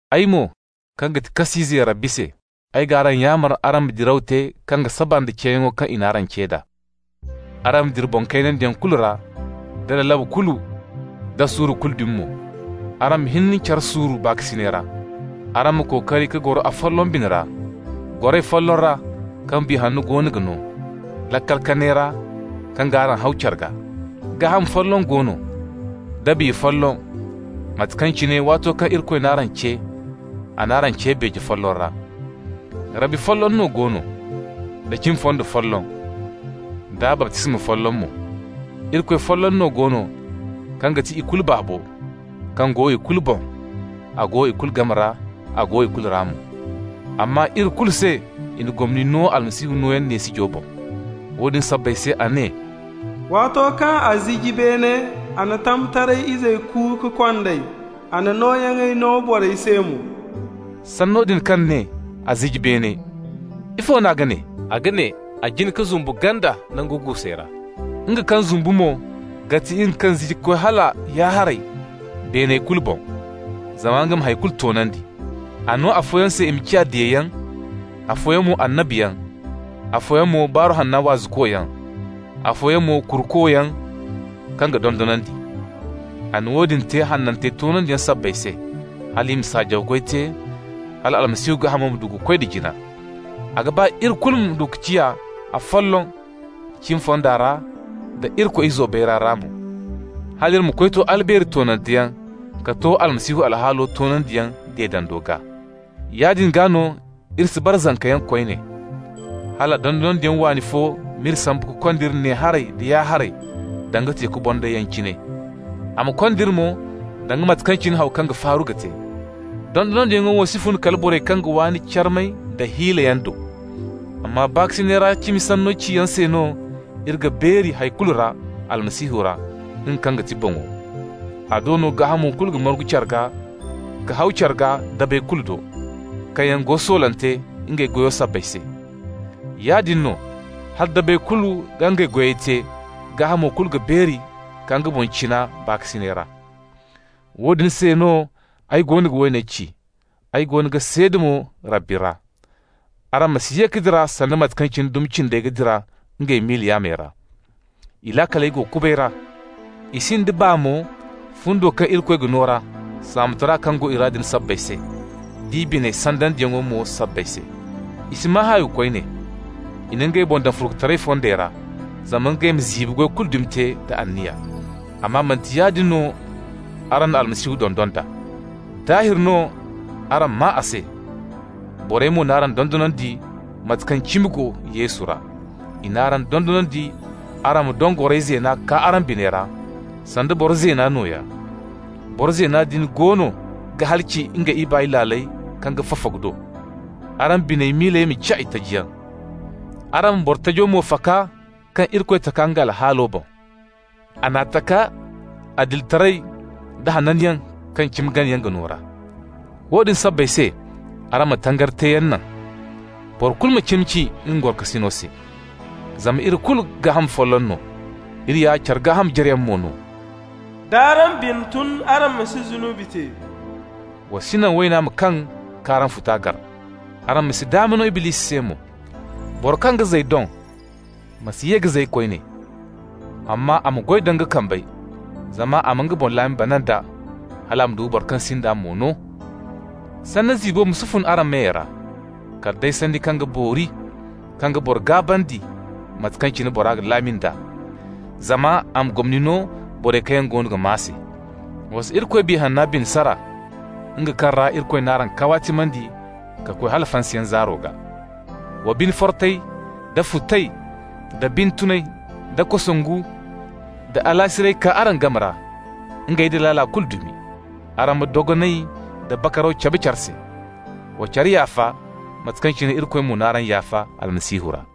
Ay mo, kaŋ ga ti kas'ize Rabbi se, ay g'araŋ yaamar araŋ ma diraw te kaŋ ga saba nda ceeyaŋo kaŋ i n'araŋ ce d'a. Araŋ ma dira boŋ kaynandiyaŋ kulu ra, da lalabu kulu, da suuru kulu dumi mo. Araŋ ma hin care suuru baakasinay ra. Araŋ ma kookari ka goro afolloŋ bine ra, goray folloŋ ra kaŋ Biya Hanno goono ga no, laakal kanay ra kaŋ g'araŋ haw care gaa. Gaaham folloŋ go no, da Biya folloŋ, mate kaŋ cine, waato kaŋ Irikoy n'araŋ ce, a n'araŋ ce beeje folloŋ ra. Rabbi folloŋ no go no, da cimi fondo folloŋ, da baptisma folloŋ mo. Irikoy folloŋ no go no kaŋ ga ti ikulu Baabo, kaŋ go ikulu boŋ, a go ikulu game ra, a go ikulu ra mo. Amma iri kulu se i na gomni no Almasihu nooyaŋ neesijo boŋ. Woodin sabbay se a ne: «Waato kaŋ a ziji beene, a na tamtaray izey ku ka kond'ey, a na nooyaŋey no borey se mo.» Sanno din kaŋ ne: «a ziji beene,» -- ifo no a ga ne? A ga ne a jin ka zumbu ganda nangu guusey ra. Nga kaŋ zumbu mo ga ti nga kaŋ ziji ka koy hala ya-haray beeney kulu boŋ, zama nga ma hay kulu toonandi. A no afooyaŋ se i ma ciya diyayaŋ, afooyaŋ mo annabiyaŋ, afooyaŋ mo Baaru Hanno waazukoyaŋ, afooyaŋ mo kurukoyaŋ kaŋ ga dondonandi. A na woodin te hanantey toonandiyaŋ sabbay se, hal i ma saajaw goy te, hal Almasihu gaahamo ma du ka koy da jina. A ga ba iri kulu ma du ka ciya afolloŋ cimi fonda ra da Irikoy Izo bayray ra mo, hal iri ma koy to albeeri toonanteyaŋ, ka to Almasihu alhaalo toonandiyaŋ deedando gaa. Yaadin gaa no iri si bara zankayaŋ koyne, hala dondonandiyaŋ waani fo m'iri sambu ka kond'iri ne-haray da ya-haray danga teeku bondayyaŋ cine. A ma kond'iri mo danga mate kaŋ cine haw kaŋ ga faaru ga te. Dondonandiyaŋo wo si fun kala borey kaŋ ga waani carmay da halliyaŋ do. Amma baakasinay ra cimi sanno ciyaŋ se no, iri ga beeri hay kulu ra Almasihu ra, nga kaŋ ga ti boŋo. A do no gaahamo kulu ga margu care gaa ka haw care gaa dabey kulu do, kaŋ yaŋ go soolante ngey goyo sabbay se. Yaadin no, hala dabey kulu ga ngey goyey te, gaahamo kulu ga beeri ka nga boŋ cina baakasinay ra. Woodin se no ay goono ga woone ci, ay goono ga seeda mo Rabbi ra: araŋ ma si ye ka dira sanda mate kaŋ dumi cindey ga dira ngey miila yaamey ra. I laakaley go kubay ra. I sinda baa mo fundo kaŋ Irikoy ga no ra, saamotara kaŋ go i ra din sabbay se, d'i bine sandandiyaŋo mo sabbay se. I si maa haawi koyne. I na ngey boŋ daŋ furkutaray fondey ra, zama ngey ma ziibi goy dumi kulu te da anniya. Amma manti yaadin no araŋ na Almasihu dondon d'a. Daahir no araŋ maa a se, borey mo n'araŋ dondonandi, mate kaŋ cimi go Yesu ra. I n'araŋ dondonandi araŋ ma doŋ goray zeena kaa araŋ biney ra, sanda boro zeena nooya. Boro zeena din goono ga halaci nga ibaay laaley kaŋ ga fafagu do. Araŋ bine miiley ma ciya itajiyaŋ. Araŋ ma boro tajo mo faka kaŋ Irikoy taka nga alhaalo boŋ. A n'a taka adilitaray da hananyaŋ kaŋ cimi ganayaŋ ga no ra. Woodin sabbay se araŋ ma tangari teeyaŋ naŋ. Boro kulu ma cimi ci nga gorokasino se. Zama iri kulu gaaham folloŋ no, iri ya care gaaham jareyaŋ mo no. D'araŋ bine tun, araŋ ma si zunubi te, wa si naŋ wayna ma kaŋ k'araŋ futa gar. Araŋ ma si daama no Iblisi se mo. Boro kaŋ ga zay doŋ ma si ye ka zay koyne. Amma a ma goy da nga kambey zama a ma nga boŋ laami bana nd'a, hal a ma du ka boro kaŋ sinda mo no. Sanni ziibo ma si fun araŋ meyey ra, kala day sanni kaŋ ga boori, kaŋ ga boro gaabandi, mate kaŋ cine bora ga laami nd'a, zama a ma gomni no borey kaŋ yaŋ goono ga maa se. Wa si Irikoy Biya Hanna bine sara, nga kaŋ ra Irikoy n'araŋ kawaatimandi ka koy hala fansayaŋ zaaro gaa. Wa bine fortay, da futay, da bine tunay, da kosongu, da alaasiray kaa araŋ game ra, ngey nda laala kulu dumi. Araŋ ma dogonay da bakaraw cabe care se. Wa care yaafa, mate kaŋ cine Irikoy mo n'araŋ yaafa Almasihu ra.